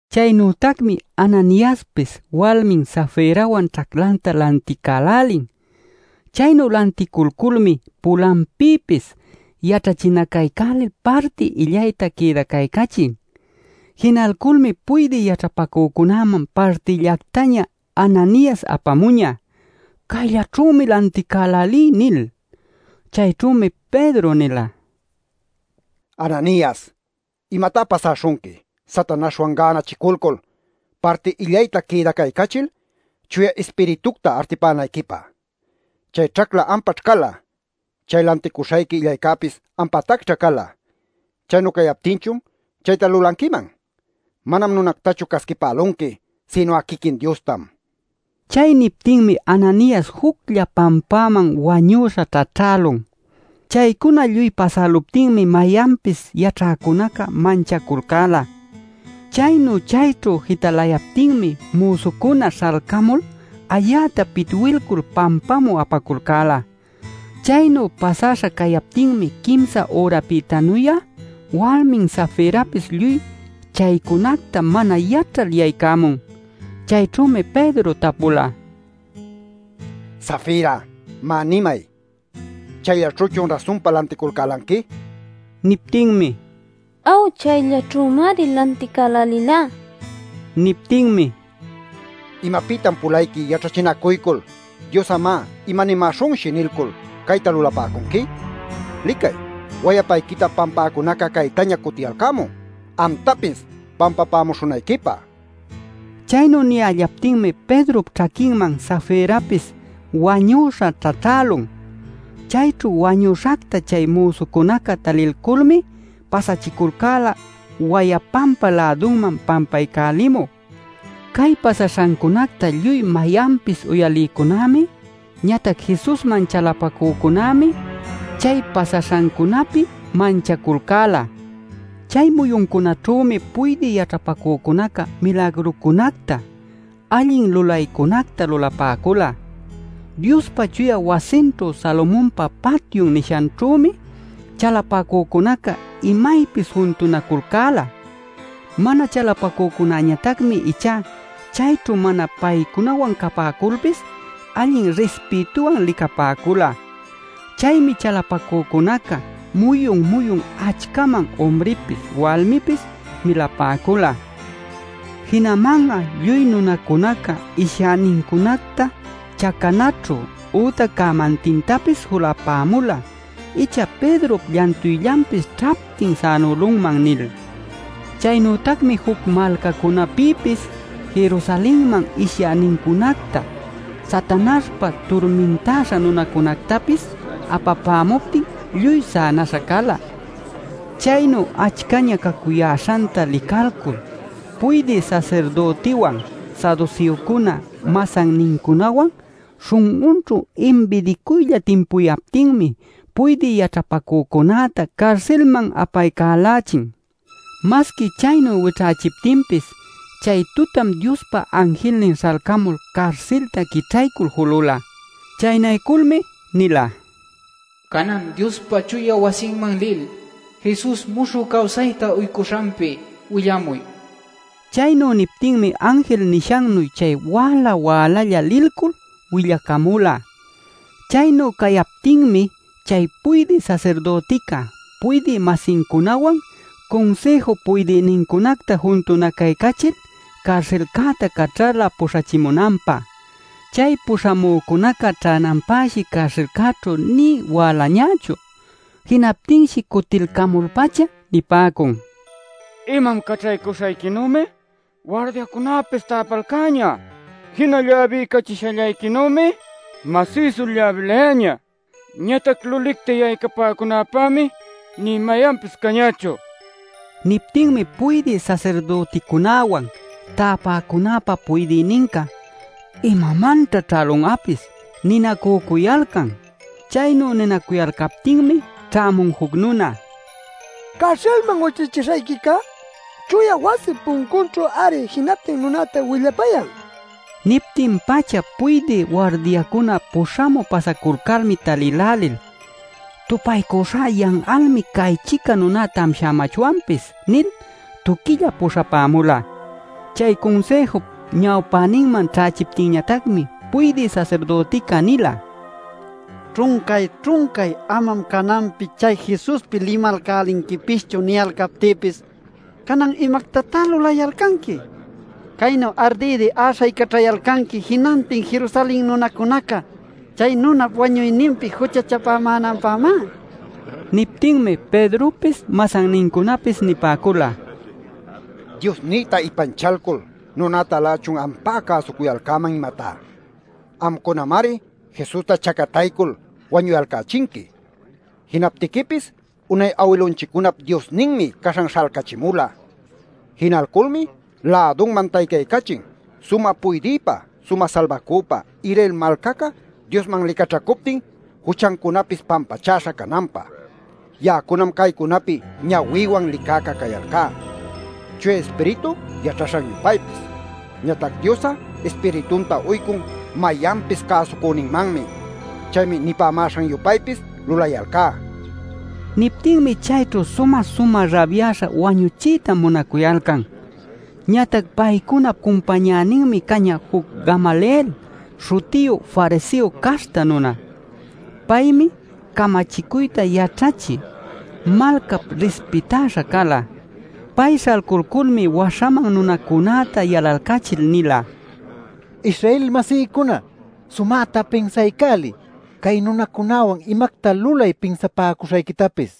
Chaynütacmi Ananiaspis walmin Safirawan ćhaclanta lanticälälin. Chaynu lanticulculmi pulanpïpis yaćhachinacaycälil parti illayta quïdacaycälichin. Jinalculmi puydï yaćhapacücunäman partillactaña Ananias apamuñä “Cayllaćhümi lanticälälí” nil. Chayćhümi Pedro nila: “Ananias, ¿imatá pasäśhunqui, Satanaśhwan gänachiculcul, parti illayta quïdacaycachil Chuya Ispiritucta artipänayquipä? Chay ćhacla ampaćh cala. Chay lanticuśhayqui illaycäpis ampatacćha cala. Chaynu cayaptinchun ¿chayta lulanquiman? Manam nunactachu casquipälunqui sinu'a quiquin Diostam” nin. Chay niptinmi Ananias juclla pampäman wañüśha ćhaćhälun. Chaycuna lluy pasäluptinmi mayanpis yaćhäcunaca manchaculcäla. Chaynu chayćhu jitalayaptinmi müsucuna śhalcamul ayäta pitwilcul pampamü apaculcäla. Chaynu pasäśha cayaptinmi quimsa ürapïtanuy'a walmin Safirapis lluy chaycunacta mana yaćhal yaycämun. Chayćhümi Pedro tapula: “Safira, má nimay ¿chayllaćhüchun rasunpa lanticulcälanqui?” nil. Niptinmi: “Aw, chayllaćhümari lanticälälilá” nila. Niptinmi: “¿Imapïtan pulayqui yaćhachinacuycul ‘Dios'a, má, ¿imanämäśhunshi?’ nilcul cayta lulapäcunqui? Licay wayapayquita pampäcunaca caytaña cutiyalcämun, amtapis pampapämuśhunayquipä” nila. Chaynu niyällaptinmi Pedrop ćhaquinman Safirapis wañüśha ćhaćhälun. Chayćhu wañüśhacta chay müsucunaca talilculmi pasachiculcäla wayapanpa lädunman pampaycälimü. Cay pasaśhancunacta lluy mayanpis uyalïcunämi ñatac Jesusman chalapacücunämi chay pasaśhancunapi manchaculcäla. Chay muyuncunaćhümi puydï yaćhapacücuna milagrucunacta, allin lulaycunacta lulapäcula. Diospa chuya wasinćhu Salomonpa patyun nishanćhümi chalapacücunaca imaypis juntunaculcäla. Mana chalapacücunañatacmi ichá chayćhu mana paycunawan capäculpis allin rispïtuwan licapäcula. Chaymi chalapacücunaca muyun-muyun achcaman umripis walmipis milapäcula. Jinaman'a lluy nunacunaca ishyänincunacta chacanaćhu ütac cämantintapis julapämula “Icha Pedrop llantuyllanpis ćhaptin sänälunman” nil. Chaynütacmi juc malcacunapïpis Jerusalenman ishyänincunacta, Satanaśhpa turmintäśha nunacunactapis apapämuptin lluy sänäśha cala. Chaynu achcaña cacuyäśhanta licalcul puydï sasirdütiwan saduseocuna masannincunawan śhun'unćhu imbidicuylla timpucuyaptinmi puydï yaćhapacücunäta carsilman apaycälächin. Masqui chaynu wićhächiptinpis chay tutam Diospa anjilnin śhalcamul carsilta quićhaycul julüla. Chaynayculmi nila: “Canan Diospa chuya wasinman lil Jesus muśhü cawsayta uycuśhanpi willamuy” nil. Chaynu niptinmi anjil nishannuy chay wäla-wälalla lilcul willacamula. Chaynu cayaptinmi chay puydï sasirdütica puydï-masincunawan Cunsïju puydïnincunacta juntunacaycachil carsilcäta caćhala puśhachimunanpä. Chay puśhamücunaca ćhänanpäshi carsilćhu nï wälañächu. Jinaptinshi cutilcamul-pacha nipäcun: “Imam caćhaycamuśhayquinümi wardiacunapis täpalcäña. Jina lläbiycachishallayquinümi masïsu lläbilayäñä. Ñatac lulicta yaycapäcunäpämi nï mayanpis cañächu” nin. Niptinmi puydï sasirdüticunäwan täpäcunäpa puydïninca “¿Imamanćha ćhälun'apis?” ninacücuyalcan. Chaynu ninacuyalcaptinmi ćhämun juc nuna: “Carsilman wićhachishayquicá chuya wasip puncunćhu-ari jinantin nunäta willapayan” nishtin. Niptin-pacha puydï wardiacuna puśhamü pasaculcalmi talïlälil “Tupaycuśhá yan'almi cay-chica nuná tamshämachwanpis” nil tuquillap puśhapämula. Chay Cunsïjup ñawpäninman ćhächiptinñatacmi puydï sasirdütica nila: “Ćhuncay-ćhuncay ‘Amam cananpi chay Jesuspi limalcälinquipischu’ niyalcaptïpis ¿canan imactatá lulayalcanqui? Caynu ardïdi äśhaycaćhayalcanqui jinantin Jerusalen nunacunaca chay nunap wañuyninpi juchachapämänanpämá” nil. Niptinmi Pedropis masannincunapis nipäcula: “¿Diosnïta ipanchalcul nunätalächun ampá cäsucuyalcäman, imatá? Amcunamari Jesusta chacataycul wañuyalcächinqui. Jinaptiquipis unay awilunchiccunap Diosninmi caśhan śhalcachimula. Jinalculmi lädunman taycaycachin sumä Puydïpä sumä Salbacüpä, Israel malcaca Diosman licaćhacuptin, juchancunapis pampachäśha cananpä. Ya'acunam caycunapi ñawïwan licäca cayalcá Chuya Ispiritu yaćhaśhan-yupaypis. Ñatac Dios'a Ispiritunta uycun mayanpis cäsüninmanmi. Chaymi nipämäśhan-yupaypis lulayalcá” nin. Niptinmi chayćhu sumä-sumä rabyäśha wañuchiyta munacuyalcan. Ñatac paycunap cumpañäninmi cañä juc Gamaliel śhutiyu fariseo caśhta nuna. Paymi camachicuyta yaćhachï, malcap rispitäśha cala. Pay śhalculculmi waśhaman nunacunäta yalalcachil nila: “Israel-masïcuna, sumäta pinsaycäliy cay nunacunäwan imacta lulay pinsapäcuśhayquitapis.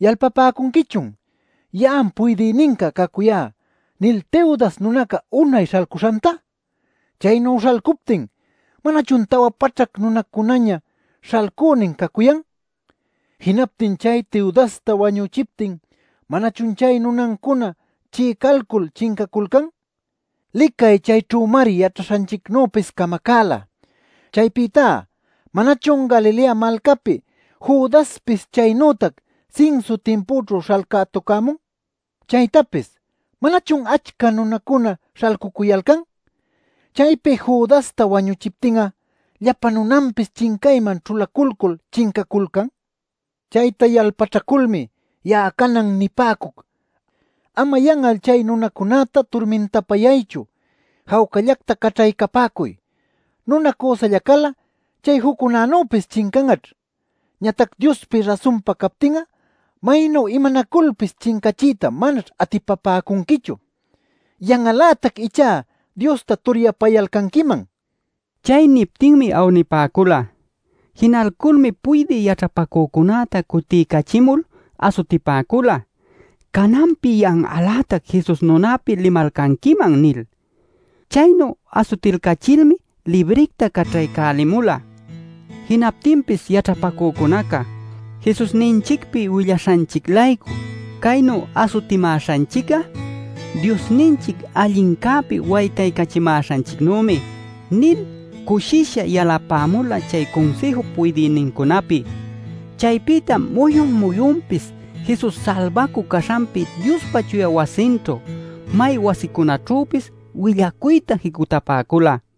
¿Yalpapäcunquichun ‘Ya'am puydïninca cacuyá’ nil Teudas nunaca unay śhalcuśhanta? Chaynu śhalcuptin ¿manachun tawa paćhac nunacunaña śhalcünin cacuyan? Jinaptin chay Teudasta wañüchiptin ¿manachun chay nunancuna chi'icalcul chincaculcan? Licay chayćhümari yaćhaśhanchicnüpis camacäla. Chaypïtá ¿manachun Galilea malcäpi Judaspis chaynütac sinsu timpućhu śhalcätucämun? Chaytapis ¿manachun achca nunacuna śhalcucuyalcan; chaypi Judasta wañüchiptin'a llapa nunanpis chincayman ćhulaculcul chincaculcan? Chayta yalpaćhaculmi ya'a canan nipäcuc, ama yan'al chay nunacunäta turmintapayaychu; jawcallacta caćhaycapäcuy. Nuna cüsalla cal'a chay juccunänüpis chincan'aćh. Ñatac Diospi rasunpa captin'a maynu imanaculpis chincachiyta manaćh atipapäcunquichu. Yan'al-lätac ichá Diosta turyapayalcanquiman” nin. Chay niptinmi awnipäcula. Jinalculmi puydï yaćhapacücunäta cutiycachimul asutichipäcula: “Cananpi yan'al-lätac Jesus nunäpi limalcanquiman” nil. Chaynu asutilcachilmi libricta caćhaycälälimula. Jinaptinpis yaćhapacücunaca “Jesusninchicpi willaśhanchic-laycu caynu asutimäśhanchic'a Diosninchic allincäpi waytachimäśhanchicnümi” nil cushisha yalapämula chay Cunsïjup puydïnincunäpi. Chaypïtam muyun-muyunpis Jesus Salbacü caśhanpi Diospa chuya wasinćhu, may wasicunaćhüpis willacuyta jicutapäcula.